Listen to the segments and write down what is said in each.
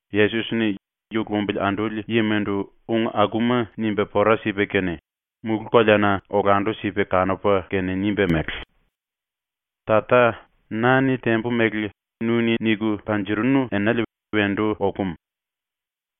Yesos-ni yu lumbili anduli yimandu ung akuma nimba pora sipa kene, mulú-koleana olandu-sipa kanupa kene nimba mele: “Tata, na-ni tembu mele nu-ni niku panjirinu enale wendu okum.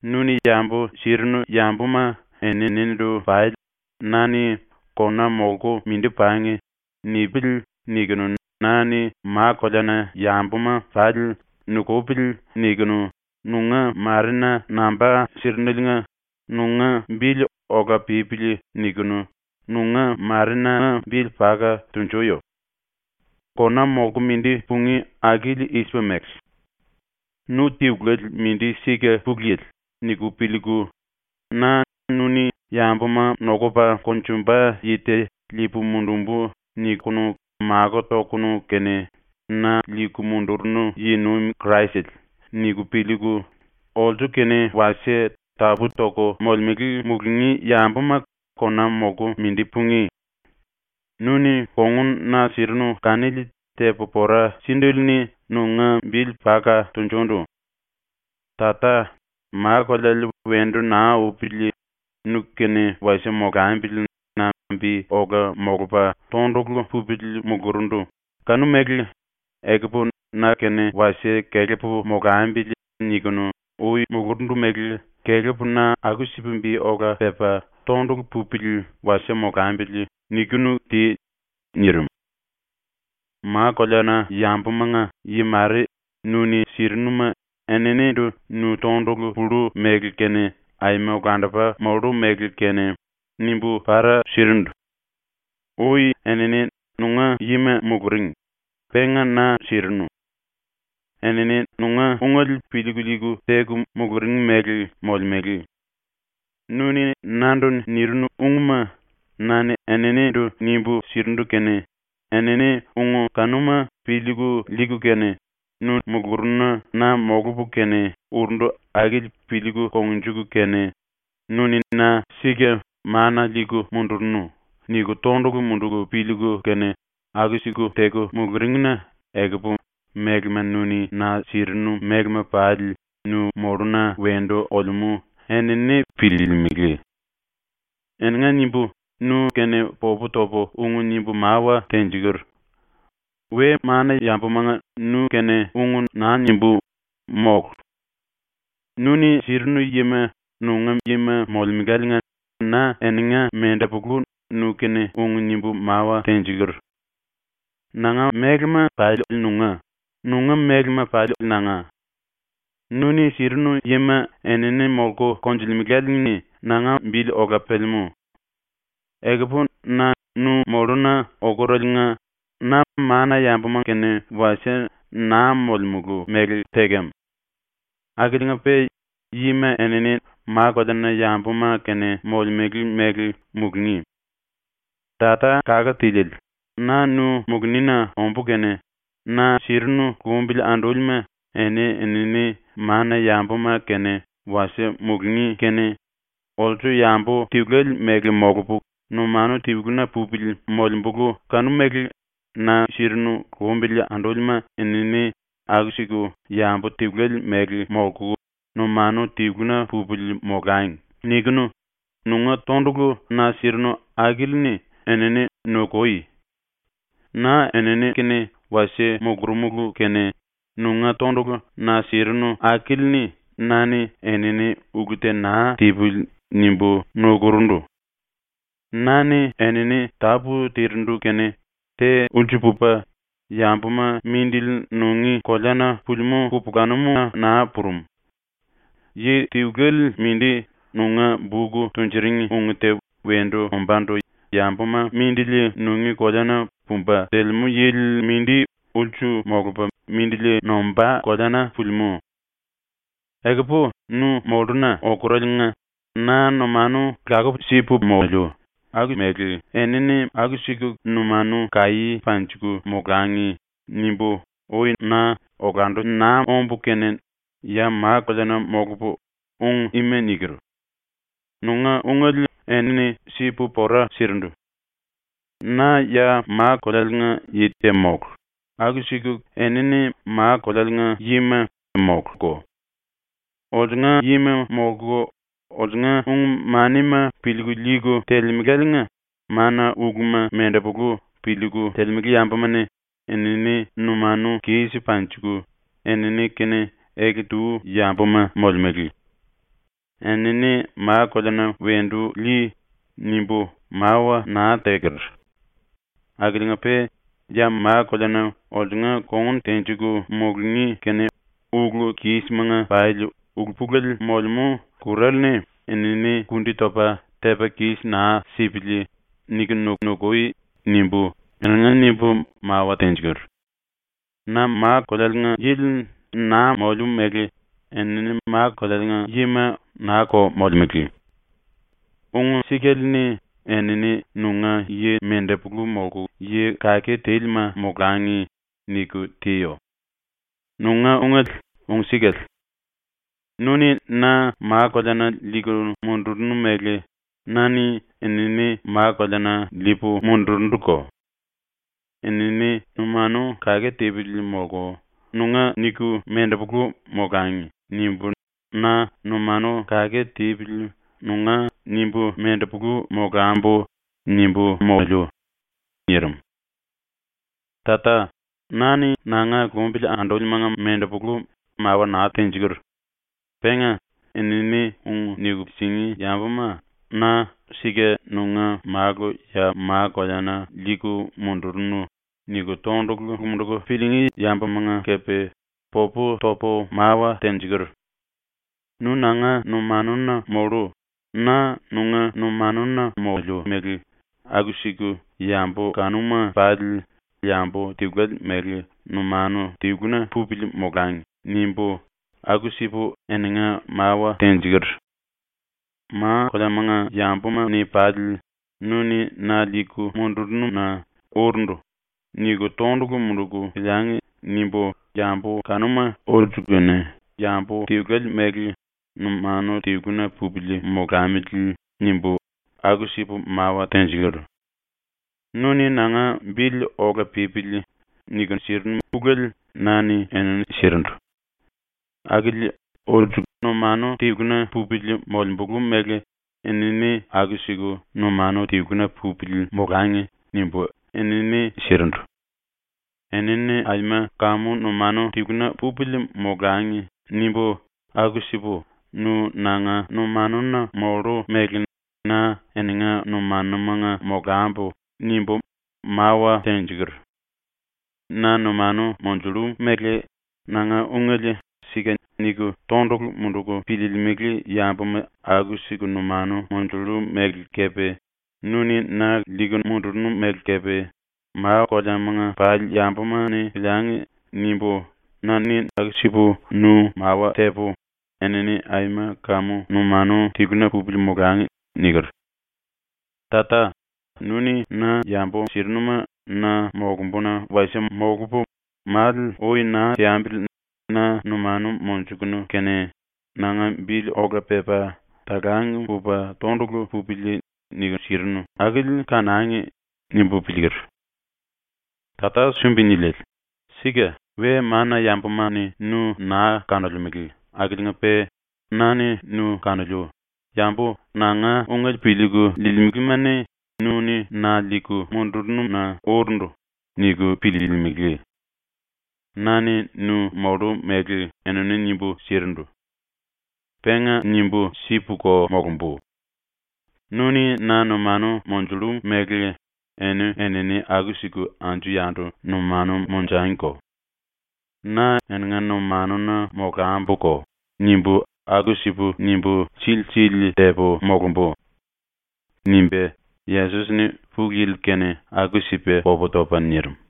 Nu-ni yambu sirinu yambuma eninindu pali na-ni ‘ ‘Kona molku mindi pangi.’ nipili.’ nikunu, na-ni ma-koleana yambuma pali ‘Nukupili.’ nikunu, nunga Marena namba sirineliinga nunga bili ‘Ola pípili.’ nikunu nunga Marenanga bili paka tunjuyo. “Kona molku mindi pungí akili i-sipa mele: ‘Nu tiluele mindi sika Pulu Yili.’ niku piliiku, ‘Na nu-ni ‘yambuma nokupa konjumba yi te liipu mundumbu.’ nikunu makó tokunu kene na liiku mundurunu yi-nuim Kraisele.’ niku piliiku, olsu-kene wasie tapú-toku molemele mulungí yambuma kona molku mindi pungí. Nu-ni kongun na sirinu kanili tepu pora síndele-ni nunga bili paka tunjundu. Tata, ma-koleale wendu naa upili nu-kene wasie molambili na bi ola molupa tondulu pupili mulurundu kanu-mele ‘Ekupu na-kene wasie kelepu molambili.’ nikunu ui mulurundu mele ‘Kelepu na aku-sipa bi ola pepa tondulu pupili wasie molambili.’ nikunu ti.” ⸤nirim.⸥ “Ma-koleana-yambumanga yi mare nu-ni sirinuma eninindu nu tondulu pullu mele kene, aima olandupa mollu mele kene, nimbu para sirindu. Ui enini nunga yima muluring, penga na sirinu. Enini nunga ungele piliiku liiku teku muluring mele molemele. Nu-ni nandu nirinu ungma na-ni eninindu nimbu sirindu kene, enini ung kanuma piliiku liiku kene nu mulurununa na molupu kene urundu akili piliiku kongnjuku kene ‘Nu-ni na sika mana liiku mundurunu.’ niku tondulu munduku piliiku kene aku-siku teku muluring-na ekupu mélema nu-ni na sirinu mélema pali nu molluna wendu olemú enini piliilimili. “Eninga nimbu nu-kene popu topu ung nimbu mawa tenjiker. We-mana-yambumanga nu-kene ung naa nimbú, mólu. Nu-ni sirinu yima nunga yima molemeláliinga na eninga mendepulu nu-kene ung nimbu mawa tenjiker. Nanga mélema pali nunga, nunga mélema pali nanga. Nu-ni sirinu yima enini molku konjulemelále-ni nanga bili ola pelemú. Ekupu na nu molluna okuraliinga na mana-yambuma-kene wasie naa molemulu mele tekem. Akiliinga-pe yima enini ma-koleana-yambuma-kene molemele mele mulungí. “Tata Kake Tiliele, na nu mulunina ombú kene na sirinu lumbili andúlima eni-enini mana-yambuma-kene wasie mulungí kene ‘Olsu yambu tiluele mele molupu numanu tiluna pupili molembulu kanu-mele na sirinu lumbili andúlima enini aku-siku yambu tiluele mele molku numanu tiluna pupili molangi.’ nikunu nunga tondulu na sirinu akili-ni enini nukui. Na enini-kene wasie mulurumulu kene nunga tondulu na sirinu akili-ni na-ni enini ‘ulu te naa tipili.’ nimbu nukurundu. Na-ni enini tápu tirindu kene te ulsu pupa yambuma mindili nungí koleana pulimú kupulanum-na naa purum. Yi tiluele mindi, nunga buk tunjuring ung te wendu ombándu yambuma mindili nungí koleana pumba telemú yili mindi ulsu molupa mindili nombá koleana pulimú. “Ekupu nu molluna okuraliinga na numanu lakuku sipu moliu ‘Aku-mele enini aku-siku numanu kaí panjiku molangi.’ nimbu ui na olandu naa ombu kene ya ma-koleana molupu ung ima niker. Nunga ungele enini sipu pora sirindu. Na ya ma-kolealiinga yi te mólu, aku-siku enini ma-kolealiinga yima móluko. Olsunga yima molku olsunga ung-manima piliiku liiku telemeláliinga mana-uluma mendepulu piliiku telemele yambuma-ni enini numanu kis panjiku enini-kene ele-tu yambuma molemele. ‘Enini ma-koleana wendu lii.’ nimbu mawa naa teker. Akiliinga-pe ‘ ‘⸤Ya ma-koleana olsunga kongun tenjiku mulungí kene⸥ ulu-kismanga pali ulu-pulele molemú ⸤kur⸥ale-ni enini kundi topa tepa kis naa sipili.’ nikunu nukui.’ nimbu eninga nimbu mawa tenjiker. Na ma-kolealiinga yili naa moliu mele enini ma-kolealiinga yima naa-ko molemele. “‘Ung-sikale-ni enini nunga yi mendepulu molku yi kake tílima molangi.’ niku tiyo. Nunga ungele ung-sikale. Nu-ni na ma-koleana liiku mundurunu mele na-ni enini ma-koleana liipu mundurunduko. ‘Enini numanu kake tipili molku nunga niku mendepulu molangi.’ nimbu na ‘numanu kake tipili nunga nimbu mendepulu molambu.’ nimbu moliu.” ⸤nirim.⸥ “Tata, na-ni nanga lumbili andúlimanga mendepulu mawa naa tenjiker. Penga enini ung niku singí yambuma ‘Na sika nunga Málu ya ma-koleana liiku mundurunu.’ niku tondulu munduku piliingí yambumanga kepe popu topu mawa tenjiker. ‘Nu nanga numanuna mollu, na nunga numanuna moliu mele aku-siku yambu kanuma pali yambu tiluele mele numanu tiluna pupili molangi.’ nimbu aku-sipu eninga mawa tenjiker. ‘Ma-koleamanga yambuma-ni pali ‘Nu-ni na liiku mundurunu-na urundu.’ niku tondulu munduku piliangi.’ nimbu ‘Yambu kanuma olsu-kene yambu tiluele mele numanu tiluna pupili molamili.’ nimbu aku-sipu mawa tenjiker. Nu-ni nanga ‘Bili ola pípili.’ niku sirinu ulele na-ni enini sirindu. Akili ‘Olsu numanu tiluna pupili molembulu mele enini aku-siku numanu tiluna pupili molangi.’ nimbu enini sirindu. ‘Enini aima kamu numanu tiluna pupili molangi.’ nimbu aku-sipu “Nu nanga numanuna mollu mele na eninga numanumanga molambu.” nimbu mawa tenjiker. Na numanu monjullu mele nanga ungele ‘Sika’ niku tondulu munduku piliilimili yambuma aku-siku numanu monjullu mele kepe ‘nu-ni na liiku mundurunu mele kepe, ma-koleamanga pali yambuma-ni piliangi.’ nimbu na-ni aku-sipu nu mawa tepu ‘Enini aima kamu numanu tiluna pupili molangi.’ niker. “Tata, ‘nu-ni na yambu sirinuma na molumbuna wasie molupu, male ui naa teambili na numanu monjukunu kene ‘nanga bili ola pepa talang pupa tondulu pupili.’ niku sirinu akili kanangi.’ nimbu piliiker. “Tata Sumbi-Niliele, sika we-mana-yambuma-ni nu naa kanolemele akiliinga-pe na-ni nu kanoliu, yambu nanga ungele piliiku liilimelema-ni ‘Nu-ni na liiku mundurunu-na urundu.’ niku piliilimili. Na-ni nu mollu mele enini nimbu sirindu. Penga nimbu sipuko molumbu. ‘Nu-ni na numanu monjullu mele eni-enini aku-siku anju-yandu numanu monjangiko. Na eninga numanuna molambuko.’ nimbu aku-sipu nimbu síli-síli tepu molumbu.” nimba Yesos-ni Pulu Yili-kene aku-sipa popu topa nirim.